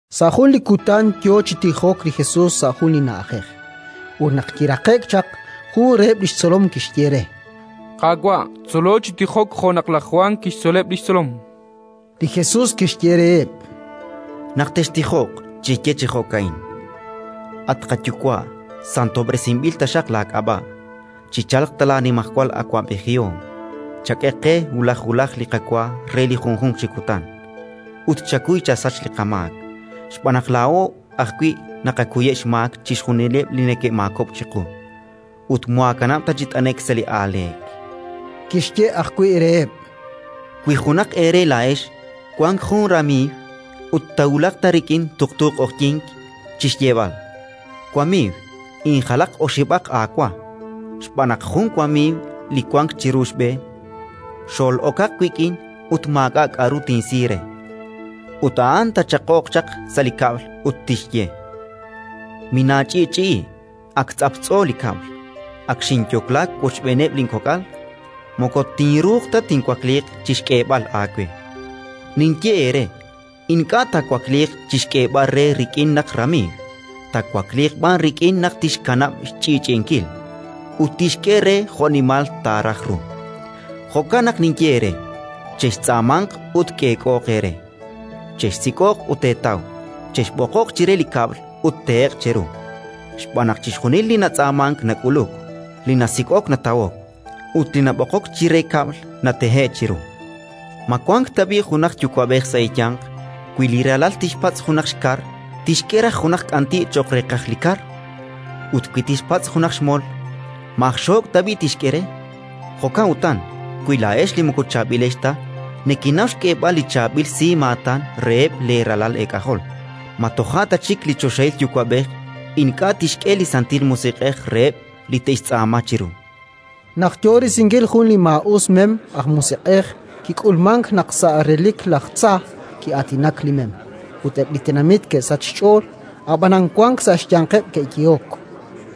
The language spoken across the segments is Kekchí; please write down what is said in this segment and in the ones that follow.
Sa' jun li kutan yo chaq chi tijok li Jesus sa' jun li na'ajej; ut naq kiraqe'k chaq, jun reheb' li xtzolom kixye re: —Qaawa', tzolo chi tijok jo' naq laj Jwan A'an laj Jwan aj kub'sihomha'. kixtzoleb' li xtzolom. Li Jesus kixye reheb': —Naq textijoq, cheye chi jo'ka'in: «At qaYuwa', santob'resinb'il taxaq laak'ab'a', chichalq ta laanimajwal awab'ejihom. Chak'e qe wulaj wulaj li qawa re li junjunq chi kutan, ut chakuy chasach li qamaak, xb'aan naq laa'o ajwi' naqakuyeb' xmaak chixjunileb' li neke'maakob'k chiqu. Ut moohaakanab' chi t'ane'k sa' li aaleek». Kixye ajwi' reheb': —Wi junaq eere laa'ex wank jun ramiiw ut taawulaq rik'in tuqtu q'oqyink chi xyeeb'al: «Wamiiw, injalaq oxib'aq aawa, xb'aan naq jun wamiiw li wank chiru xb'e xol'okaq wik'in ut maak'a' k'aru tinsi re»; ut a'an taachaq'oq chaq sa' li kab'l ut tixye: «Minaach'i'ch'i'i; ak tz'aptz'o li kab'l, ak xinyokla wochb'eeneb' linkok'al. Moko tinruuq ta tinwakliiq chi xk'eeb'al aawe», ninye eere: ink'a' taawakliiq chi xk'eeb'al re rik'in naq ramiiw, taawakliiq b'an rik'in naq tixkanab' xch'i'ch'i'inkil, ut tixk'e re jo'nimal taaraj ru. “Jo'kan naq ninye eere: chextz'aamanq ut k'eek'ooq eere; chexsik'oq ut teetaw; chexb'oqoq chire kab'l ut tehe'q cheru. Xb'aan naq chixjunil li natz'aamank nak'uluk; li nasik'ok natawok, ut li nab'oqok chire kab'l natehe'k chiru. “Ma wank tab'i' junaq yuwa'b'ej sa' eeyanq, wi li ralal tixpatz' junaq xkar, tixk'e raj junaq k'anti' cho'q reeqaj li kar? Ut wi tixpatz' junaq xmol, ma aj xook' tab'i' tixk'e re? Jo'kan utan, wi laa'ex li moko chaab'ilex ta nekenaw xk'eeb'al li chaab'il simaatan reheb' leeralal eek'ajol, ma toja' ta chik li choxahil Yuwa'b'ej ink'a' tixk'e li Santil Musiq'ej reheb' li te'xtz'aama chiru!”. Naq yo risinkil jun li maa'us mem aj musiq'ej, kik'ulmank naq sa' relik laj tza ki'aatinak li mem; ut eb' li tenamit ke'sachk xch'ool. Ab'anan wank sa' xyanqeb' ke'yehok: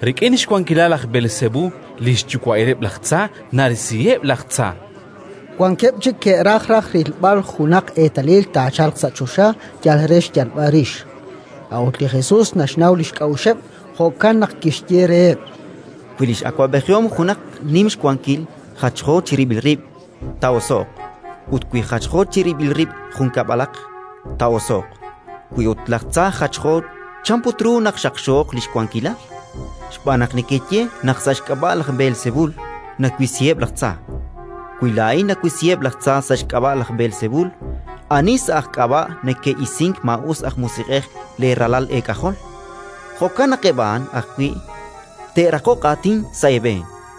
“Rik'in xwankilal laj Beelsebul, li xyuwa'ileb' laj tza, narisiheb' laj tza”. Wankeb' chik ke'raj raj rilb'al junaq eetalil taachalq sa' choxa, yal re xyalb'al rix. A'ut li Jesus naxnaw li xk'a'uxeb', jo'kan naq kixye reheb': “Wi li x'awab'ejihom junaq nim xwankil jachjo chirib'il rib', taa'oso'q. Ut wi jachjo chirib'il rib' jun kab'alaq, taa'oso'q. Wi ut laj tza jachjo, chan put ru naq xaqxooq li xwankilal? Xb'aan naq nekeye naq sa' xk'ab'a' laj Beelsebul nawisiheb' laj tza. “Wi laa'in nawisiheb' laj tza sa' xk'ab'a' laj Beelsebul, ani sa' aj k'ab'a' neke'isink maa'us aj musiq'ej leeralal eek'ajol? Jo'kan naq eb' a'an ajwi' te'raqoq aatin sa' eeb'een.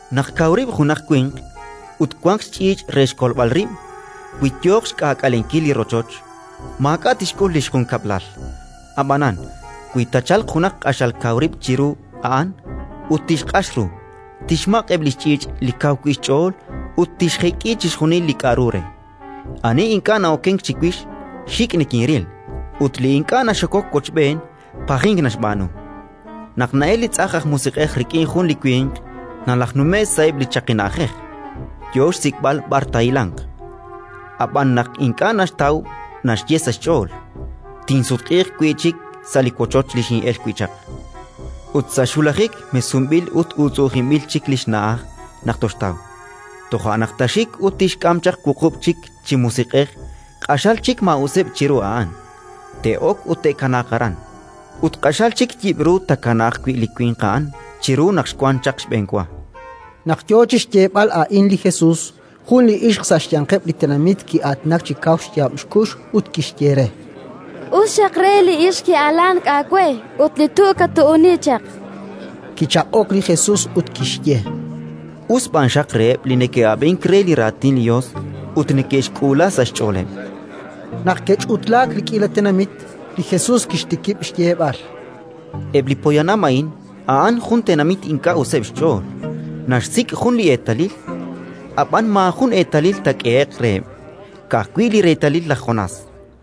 “Naq kaw rib' junaq winq ut wanq xch'iich' re xkolb'al rib', wi yooq xk'aak'alenkil li rochoch, maak'a' tixk'ul li xjunkab'lal. Ab'anan, wi taachalq junaq q'axal kaw rib' chiru a'an ut tixq'ax ru, tixmaq' eb' li xch'iich' li kaw wi' xch'ool ut tixjek'i chixjunil li k'aru re. “Ani ink'a' na'okenk chiwix, xik' nikinril; ut li ink'a' naxokok wochb'een, pajink naxb'aanu. “Naq na'elk li tz'ajn aj musiq'ej rik'in jun li winq, nalajnume'k sa'eb' li chaqi na'ajej, yo xsik'b'al b'ar taahilanq; ab'an naq ink'a' naxtaw, naxye sa' xch'ool: «Tinsutq'iiq wi' chik sa' li wochoch li xin'elk wi' chaq». Ut sa' xwulajik, mesunb'il ut uutz'u'ujinb'il chik li xna'aj naq toxtaw. Toja' naq taaxik ut tixk'am chaq wuqub' chik chi musiq'ej, q'axal chik maa'useb' chiru a'an. Te'ok ut te'kanaaq aran; ut q'axal chik yib'ru taakanaaq wi' li winq a'an chiru naq xwank chaq xb'enwa”. Naq yo chi xyeeb'al a'in li Jesus, jun li ixq sa' xyanqeb' li tenamit ki'aatinak chi kaw xyaab' xkux ut kixye re: —Us xaq re li ixq ki'alank aawe ut li tu' kattu'unk chaq! Kichaq'ok li Jesus ut kixye: —Us b'an xaq reheb' li neke'ab'ink re li raatin li Yos ut neke'xk'uula sa' xch'ooleb'! Naq ke'ch'utlaak li k'iila tenamit, li Jesus kixtikib' xyeeb'al: “Eb' li poyanam a'in a'an jun tenamit ink'a' useb' xch'ool. Naxsik' jun li eetalil, ab'an maajun eetalil taak'ehe'q reheb', ka'ajwi' li reetalil laj Jonás.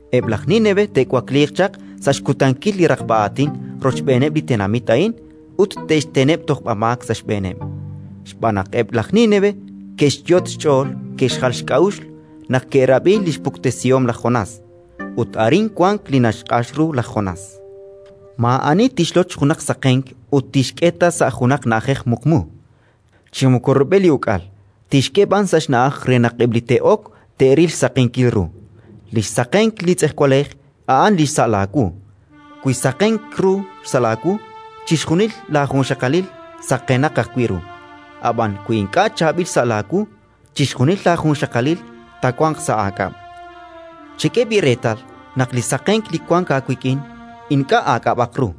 Eb' laj Nínive te'wakliiq chaq sa' xkutankil li raqb'a aatin rochb'eeneb' li tenamit a'in ut te'xteneb' tojb'amaak sa' xb'eeneb', xb'aan naq eb' laj Nínive ke'xyot' xch'ool ke'xjal xk'a'uxl naq ke'rab'i li xpuktesihom laj Jonás; ut arin wank li naxq'ax ru laj Jonás. “Maa'ani tixloch junaq saqenk ut tixk'e ta sa' junaq na'ajej muqmu, chi moko rub'el li uk'al, tixk'e b'an sa' xna'aj re naq eb' li te'ok te'ril li xsaqenkil ru. Li xsaqenk li tz'ejwalej a'an li xsa' laawu. Wi saqenk ru xsa' laawu, chixjunil laajunxaqalil saqenaq ajwi' ru; ab'an wi ink'a' chaab'il xsa' laawu, chixjunil laajunxaqalil taawanq sa' aak'ab'. Chak'e b'i' reetal naq li saqenk li wank aawik'in ink'a' aak'ab'aq ru.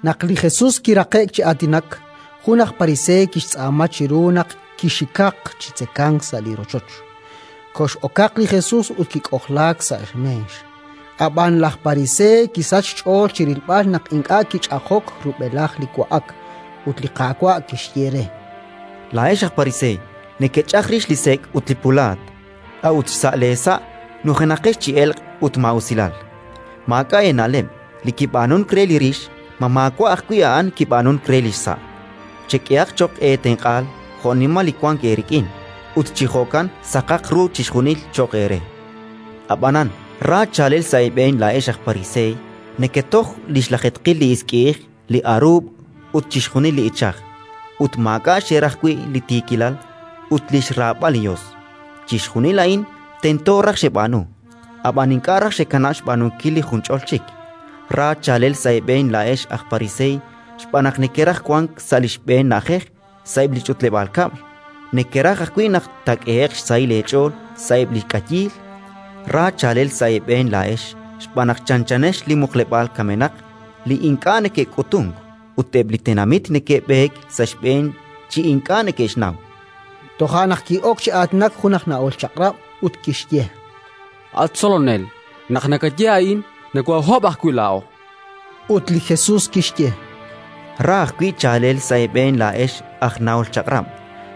Naq li Jesus kiraqe'k chi aatinak, jun aj pariseey kixtz'aama chiru naq chixikaq chi tzekank sa' li rochoch. Kox'okaq li Jesus ut kik'ojlaak sa' meex. Ab'an laj pariseey kisachk xch'ool chi rilb'al naq ink'a' kich'ajok rub'elaj li wa'ak. Ut li Qaawa' kixye re: —Laa'ex aj pariseey nekech'aj rix li sek' ut li pulaat, a'ut sa' leesa' nujenaqex chi elq' ut maa'usilal! Maak'a' eena'leb'! Li kib'aanunk re li rix, ma maawa' ajwi' a'an kib'aanunk re li xsa'? Chek'ehaq cho'q eetenq'aal jo'nimal li wank eerik'in, ut chi jo'kan saqaq ru chixjunil cho'q eere. “Ab'anan ra chaalel sa' eeb'een laa'ex aj pariseey: neketoj li xlajeetqil li isk'i'ij, li aruub' ut chixjunil li ichaj, ut maak'a' xeraj wi' li tiikilal ut li xraab'al li Yos. Chixjunil a'in tento raj xeb'aanu, ab'an ink'a' raj xekanab' xb'aanunkil li junch'ol chik. “Ra chaalel sa' eeb'een laa'ex aj pariseey, xb'aan naq nekeraj wank sa' li xb'een na'ajej sa'eb' li ch'utleb'aal kab'l; nekeraj ajwi' naq taak'ehe'q xsahil eech'ool sa'eb' li k'ayiil. “Ra chaalel sa' eeb'een laa'ex, xb'aan naq chanchanex li muqleb'aal kamenaq li ink'a' neke'k'utunk, ut eb' li tenamit neke'b'eek sa' xb'een chi ink'a' neke'xnaw!”. Toja' naq ki'ok chi aatinak jun aj nahol Chaq'rab' ut kixye: —At Tzolonel, naq nakaye a'in, nokoohaahob' ajwi' laa'o. Ut li Jesus kixye: —Ra ajwi' chaalel sa' eeb'een laa'ex aj nahol Chaq'rab',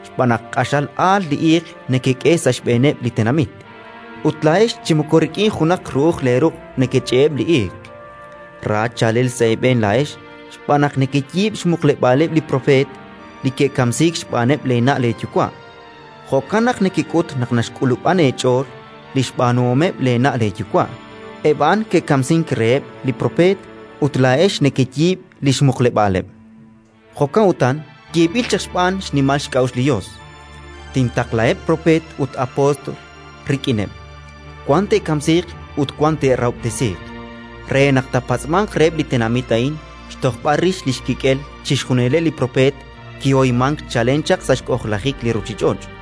xb'aan naq q'axal aal li iiq nekek'e sa' xb'eeneb' li tenamit, ut laa'ex chi moko rik'in junaq ru'uj leeruq' nekech'e'eb' li iiq. “Ra chaalel sa' eeb'een laa'ex, xb'aan naq nekeyiib' xmuqleb'aaleb' li propeet li ke'kamsiik xb'aaneb' leena' leeyuwa'. Jo'kan naq nekek'ut naq naxk'ulub'an eech'ool li xb'aanuhomeb' leena' leeyuwa': eb' a'an ke'kamsink reheb' li propeet ut laa'ex nekeyiib' li xmuqleb'aaleb'! “Jo'kan utan yeeb'il chaq xb'aan li xnimal xk'a'uxl li Yos: «Tintaqlaheb' propeet ut apóstol rik'ineb': wan te'kamsiiq ut wan te'rahob'tesiiq», re naq taapatz'manq reheb' li tenamit a'in xtojb'al rix li xkik'el chixjunileb' li propeet li kihoymank chalen chaq sa' xk'ojlajik li ruuchich'och',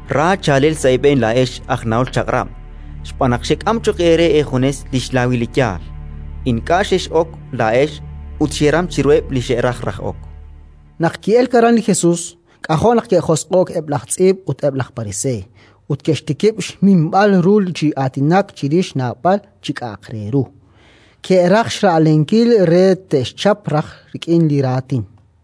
“Ra chaalel sa' eeb'een laa'ex aj nahol Chaq'rab', xb'aan naq xek'am cho'q eere eejunes li xlaawil li yaal. Ink'a' xex'ok laa'ex ut xeram chiruheb' li xe'raj raj ok”. Naq ki'elk aran li Jesus, k'ajo' naq ke'josq'o'k eb' laj tz'iib' ut eb' laj pariseey, ut ke'xtikib' xminb'al ru chi aatinak chirix naab'al li k'a'aq re ru. Ke'raj xra'lenkil re te'xchap raj rik'in li raatin.